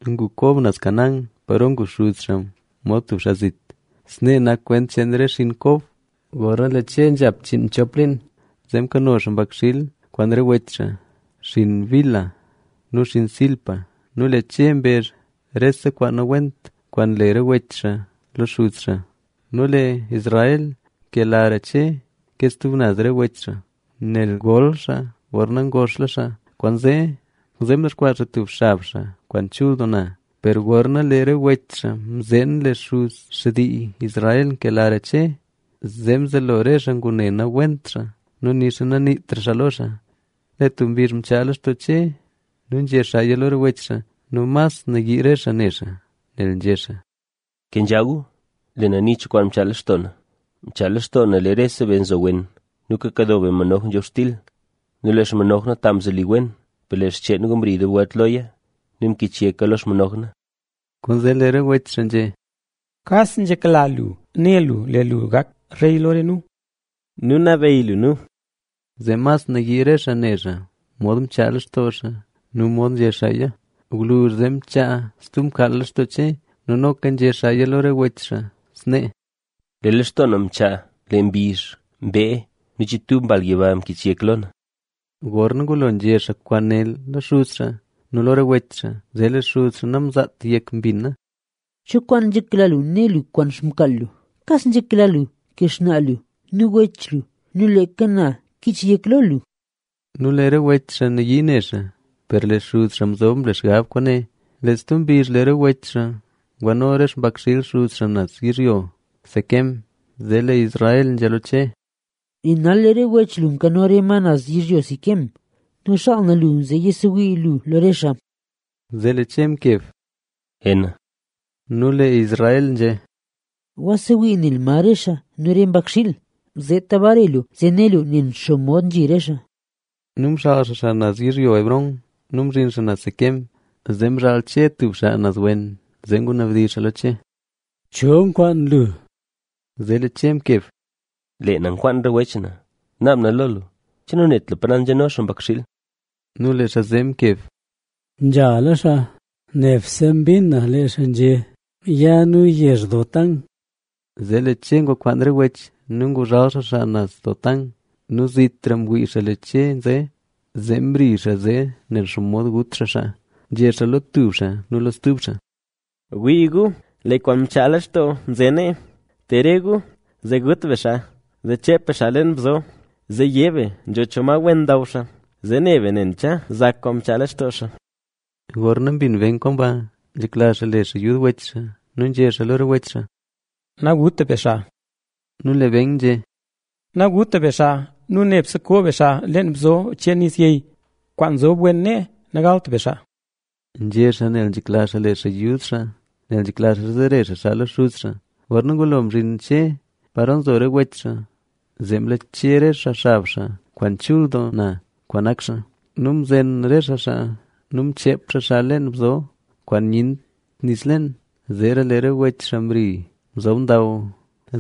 Ngu Kob naz Canaán, paro ngu xuz xaa mod tub xaa zit. Snee nak kwent cheen re xiin Kob. Gorna lee Che nzhap chiinmchop liin, zee mkano xaa mbakxiil kwaan re wech xaa, xinn Bilha nu xinn Zilpa. Nu lee Che mbezh rese kwaan nawent kwaan nle re wech xaa lo xuz xaa. Nu lee Israel nkelara Che ke stub naz re wech xaa, nel ngol xaa gorna ngoxla xaa. Kwaanzee mdexkwaa xaa tub xab xaa kwaan chul doo na. Per gorna lee re wech xaa mzeen lee xuz xtii Israel nkelara Che, zee mzelo re xaa ngune nawent xaa nu nixa naniitra xaa lo xaa. Lee tub mbizh mchaa lextoo Che nu nzhé xaaya lo re wech xaa nu mas nayii re xaa ne xaa, nel nzhé xaa: —Kenzha gu, lee na ni cho kwaan mchaa lextoo na. Mchaa lextoo na lee rese be nzo wen nu kakado be manoj nzhobxtil nu lee xmanoj na ta mzoli wen, per lee xcheen gu mri dub welt loya nu mkich yeka lo xmanoj na. Kwaanzee lee re wech xaa mkeb nzhé: —¿Che kas nzhekla lu né lu, lee lu gak rey lo re nu nu nabeyy lu nu? Zee mas nayii re xaa ne xaa, mod mchaa lextoo xaa nu mod nzhé xaaya. Gwluzh zee mchaa stub mkaal lextoo Che nu noka nzhé xaaya lo re wech xaa snee: —Lee lextoo na mchaa lee mbizh, mbee nu chiibtub mbal yiba mkich yek lo na. Gorna ngulo nzhé xaa kwaane lo xuz xaa nu lo re wech xaa, zee lee xuz xaa namzaat yek mbina. —¿Cho kwaan nzhekla lu né lu kwaan xmkaal lu? ¿Kas nzhekla lu lee xnaa lu nu re wech lu nu leeka na kich yek lo lu? Nu lee re wech xaa nayii ne xaa, per lee xuz xaa mzob mle xgab kwaane. Lee tub mbizh, lee re wech xaa ngwano re xpakxiil xuz xaa naz yizhyo Siquem. Zee lee Israel nzhé lo Che: —Lee nal lee re wech lu nkano re ma naz yizhyo Siquem. Nzhakla na ya lu zee yasewii lu lo re xaa. Zee lee Che mkeb: —Ena. Nu lee Israel nzhé: —Gwasewii nel ma re xaa nu re mbakxiil, zeeta bare lu zee né lu nen xomod nzhi re xaa. Nu mxaal xaa xaa naz yizhyo Hebrón nu mzhin xaa naz Siquem. Zee mzhaal Che tub xaa naz wen, zee ngunabdizh xaa lo Che: —¿Cho nkwaan lu? Zee lee Che mkeb: —Lee na nkwaan re wech na. Nabdizh na lo lu, ¿che nanet lu pa naz nzhano xaa mbakxiil? Nu lee xaa zee mkeb: —Nyala xaa nee. Nebse mbin na lee xaa nzhé: “Ya nu yezh Dotán”. Zee lee Che ngwa kwaan re wech nu nguzhal xaa xaa naz Dotán. Nu zitra mwii xaa lee Che nze, zee mdizh xaa zee nen xomod ngut xaa xaa. Nzhé xaa lo tub xaa nu stuba xaa: —¡Wii gu, lee kwaan mchaa lextoo nze nee! Te re gu, zee gut be xaa; zee cheep be xaa leen bzo, zee yé be nzho cho ma wen ndaw xaa. Zee ne be nen cha zak kwaan mchaa lextoo xaa. Gorna mbin Ben kwaan ba, nzhekla xaa le xaa yud wech xaa nu nzhé xaa lo re wech xaa: —Naguta be xaa. Nu lee Ben nzhé: —Naguta be xaa nu nebse ko be xaa leen bzo cheen nis yey, kwaan nzob wen nee. Nagalt be xaa —nzhé xaa nel nzhekla xaa le xaa yud xaa, nel nzhekla xaa zare xaa xaa lo xuz xaa. Gorna ngulo mzhin Che paro nzo re wech xaa, zee mlache re xaa xab xaa kwaan chul doo na, kwaan nak xaa. Nu mzen re xaa xaa nu mcheep xaa xaa leen bzo, kwaan nyent nis leen. Zeera lee re wech xaa mri mzob ndaw.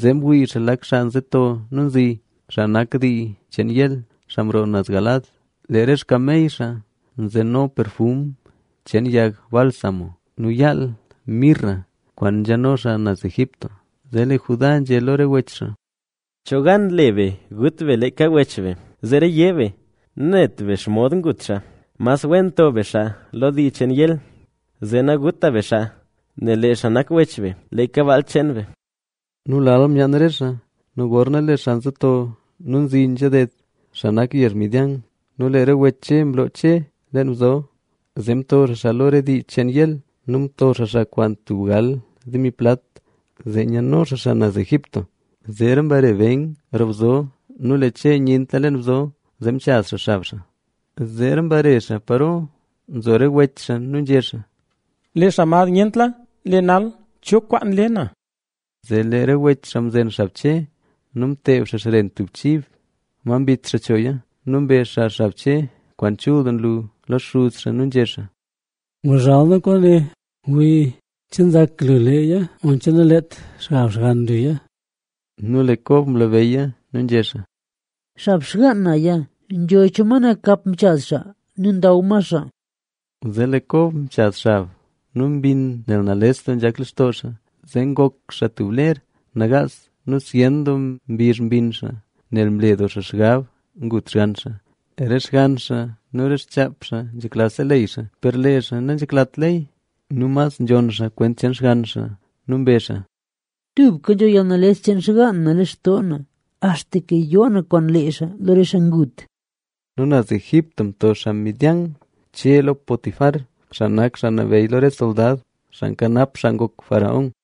Zee mwii xaa lee lak xaa nze nto nu nzi, xaa nak dii cheen Ismael, xaa mroo naz Galaad. Lee re xkamey xaa nzeno perfum cheen yag bálsamo nu yaal mirra kwaan nzhano xaa naz Egipto. Zee lee Judá nzhé lo re wech xaa: —¿Cho gan le be gut be leeka wech be? Zeera yé be: “Nanet be xomod ngut xaa”. Mas wen to be xaa lo dii cheen Ismael. Zee naguta be xaa, nel lee xaa nak wech be, leeka baal cheen be. Nu lal myaan re xaa. Nu gorna lee xaa nto nze nu nzi nzha ded, xaa nak yezh Midian nu lee re wech Che mloo Che leen bzo, zee mto xaa xaa lo re xaa dii cheen Ismael. Nu mto xaa xaa kwaan tub gal demi plat. Zee nyano xaa xaa naz Egipto. Zeera mbare Ben roo bzo nu lee Che nyentla leen bzo, zee mchaz xaa xab xaa. Zeera mbare xaa paro nzo re wech xaa nu nzhé xaa: —¡Lee xaa mad nyentla! Lee nal, ¿cho kwaan le na? Zee lee re wech xaa mzen xab Che nu mteeb xaa xren tub chib, ma mbit xaa choya. Nu mbe xaa xab Che, kwaan chul doo nlu lo xuz xaa nu nzhé xaa: —Nguzhal nu kwaane, wii, ¿che nzak lu leeya oncha naleet xab xgann luya? Nu lee Kob mlabeyya nu nzhé xaa: —¡Xab xgaan naya! Nzho cho ma nakap mchaz xaa nu ndaw ma xaa! Zee lee Kob mchaz xab nu mbinn nel nales doo nzhak lextoo xaa. Zee ngok xaa tub ler nagaas nu zyen doo mbizh mbinn xaa nel mle doo xaa xgab ngut xgann xaa. Re xgann xaa nu re xchaap xaa nzhekla seleyy xaa, per lee xaa nanzheklat leyy nu mas nzhonn xaa kwent cheen xgann xaa nu mbezh xaa: —¡Tubka nzho yalnales cheen xgaan na lextoo na, axtaka yoo na kwaan lee xaa lo re xaa ngut! Nu naz Egipto mto xaa Midian Che lo Potifar, xaa nak xaa nabeyy lo re soldad, xaa nkanap xaa ngok faraón.